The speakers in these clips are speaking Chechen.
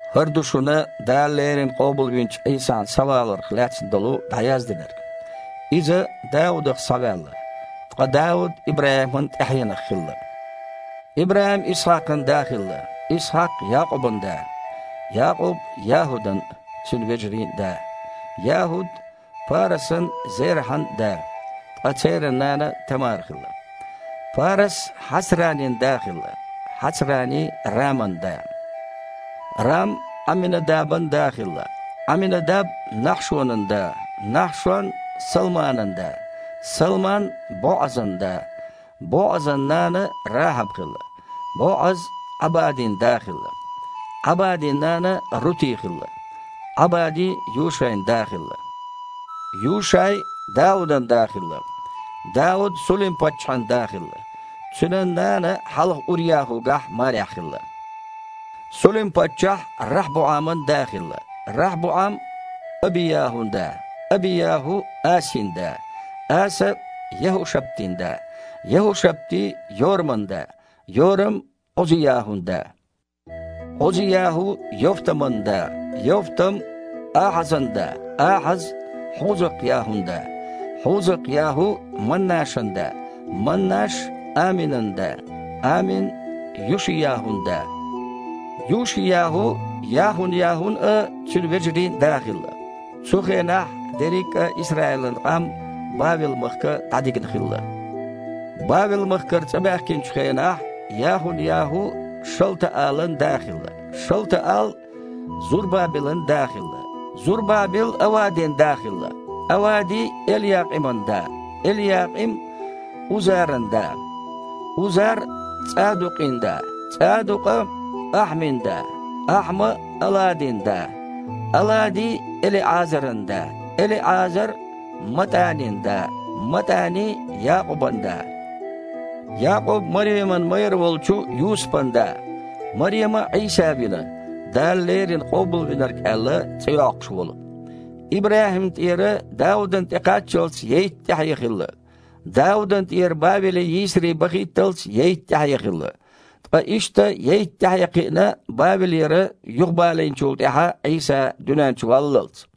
ХІара ду шуна Дала леррина къобалвинчу Іийсан схьаваларх лаьцна долу дІаяздинарг. Иза Даудах схьаваьлла, ткъа Дауд ИбрахІиман тІаьхьенах хилла. ИбрахІим Исхьакхан да хилла, Исхьакх – Якъубан да, Якъуб – ЯхІудан а, цуьнан вежарийн а да, ЯхІуд – Парасан а, Зерахьан а да, ткъа церан нана Тамара хилла. Парас Хьацранин да хилла, Хьацрани – Раман да. Рам Іамминадабан да хилла, Іамминадаб – Нахьшонан да, Нахьшон – Салманан да, Салман – БоІазан да. БоІазан нана Рахьаб хилла. БоІаз Іабадин да хилла. Іабадин нана Рути хилла. Іабади Юшайн да хилла, Юшай – Даудан да хилла. Дауд Сулим-паччахьан да хилла, цуьнан нана хьалха УръяхІугахь марехь хилла. Сулим-паччахь РахьбуІаман да хилла, РахьбуІам – Аби-ЯхІун да, Аби-ЯхІу – Асин да, Аса – ЯхІушаптин да, ЯхІушапти – Йораман да, Йорам – Іузи-ЯхІун да, Іузи-ЯхІу – Йовтаман да, Йовтам – Ахьазан да, Ахьаз – Хьузакх-ЯхІун да, Хьузакх-ЯхІу – Маннашан да, Маннаш – Аминан да, Амин – Юши-ЯхІун да, Юши-ЯхІу – Яхун-ЯхІун а, цуьнан вежарийн а да хилла. Цу хенахь дерриг а Исраилан къам Бавел-махка дІадигна хилла. Бавел-махкара цІа баьхкинчу хенахь Яхун-ЯхІу Шалтаалан да хилла, Шалтаал Зурбабелан да хилла, Зурбабел – Авадин да хилла, Авади – Элъякъиман да, Элъякъим – Узаран да, Узар – ЦІадукъин да, ЦІадукъа – Ахьмин да, Ахьма – Аладин да, Алади – ЭлиІазаран да, ЭлиІазар – МатІанин да, МатІани – Якъубан да, Якъуб – Мареман майра волчу Юсупан да. Марема Іийса вина, Дала леррина Къобалвинарг аьлла, цІе йоккхуш волу. ИбрахІимна тІера Даудана тІе кхаччалц ейтта тІаьхье хилла, Даудана тІера Бавеле йийсаре бахийтталц – ейтта тІаьхье хилла, ткъа иштта ейтта тІаьхье кхиъна Бавелера юхабалийначул тІаьхьа Іийса дуьнен чу валлалц.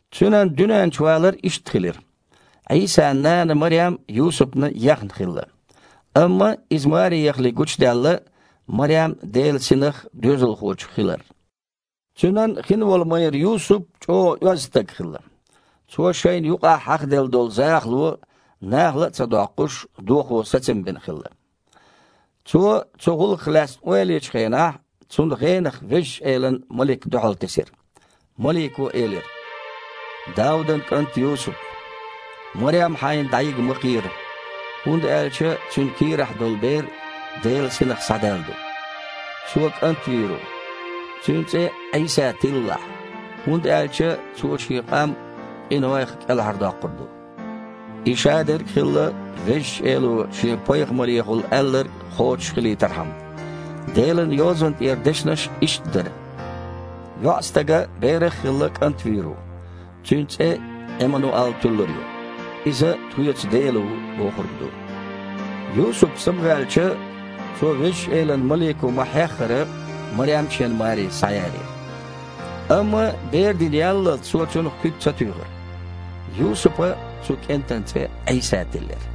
Цуьнан дуьнен чу валар иштта хилира: Іийсан нана Марем Юсупна ехна хилла. Амма иза маре яхале гучудаьлла Марем Делан Синах доьзалхочух хилар. Цуьнан хин волу майра Юсуп чІогІа оьзда стаг хилла. Цо шайна юкъахь хьахаделла долу захало, нахала а ца доккхуш, дохо сацам бина хилла. Цо цу гІуллакхах лаьцна ойла ечу хенахь, цунна гІенах Везачу Элан малик дуьхьалтесира. Малико элира: « Даудан кІант Юсуп, Марем хьайна дІайига ма кхера, хІунда аьлча цуьнан кийрахь долу бер Делан Синах схьадаьлла ду. Цо кІант вийр ву. Цуьнан цІе Іийса тиллалахь, хІунда аьлча Цо Шен къам къинойх кІелхьардоккхур ду». И шадерг а хилла, Везачу Эло Шен пайхамарехула аьлларг кхочуш хилийтархьама. Делан Йозанна тІера дешнаш иштта дара: «ЙоІстага, берах а хилла, КІант вийр ву, Цуьнан цІе Іимануал туьллур ю. Иза „Тхоьца Дела ву!“ – бохург ду». Юсуп самаваьлча, цо, Везачу Элан малико ма-хьеххара, Марем шена маре схьаялийра. Амма бер дина яллалц, цо цунах куьг ца туьйхира. Юсупа цу кІентан цІе Іийса тиллира.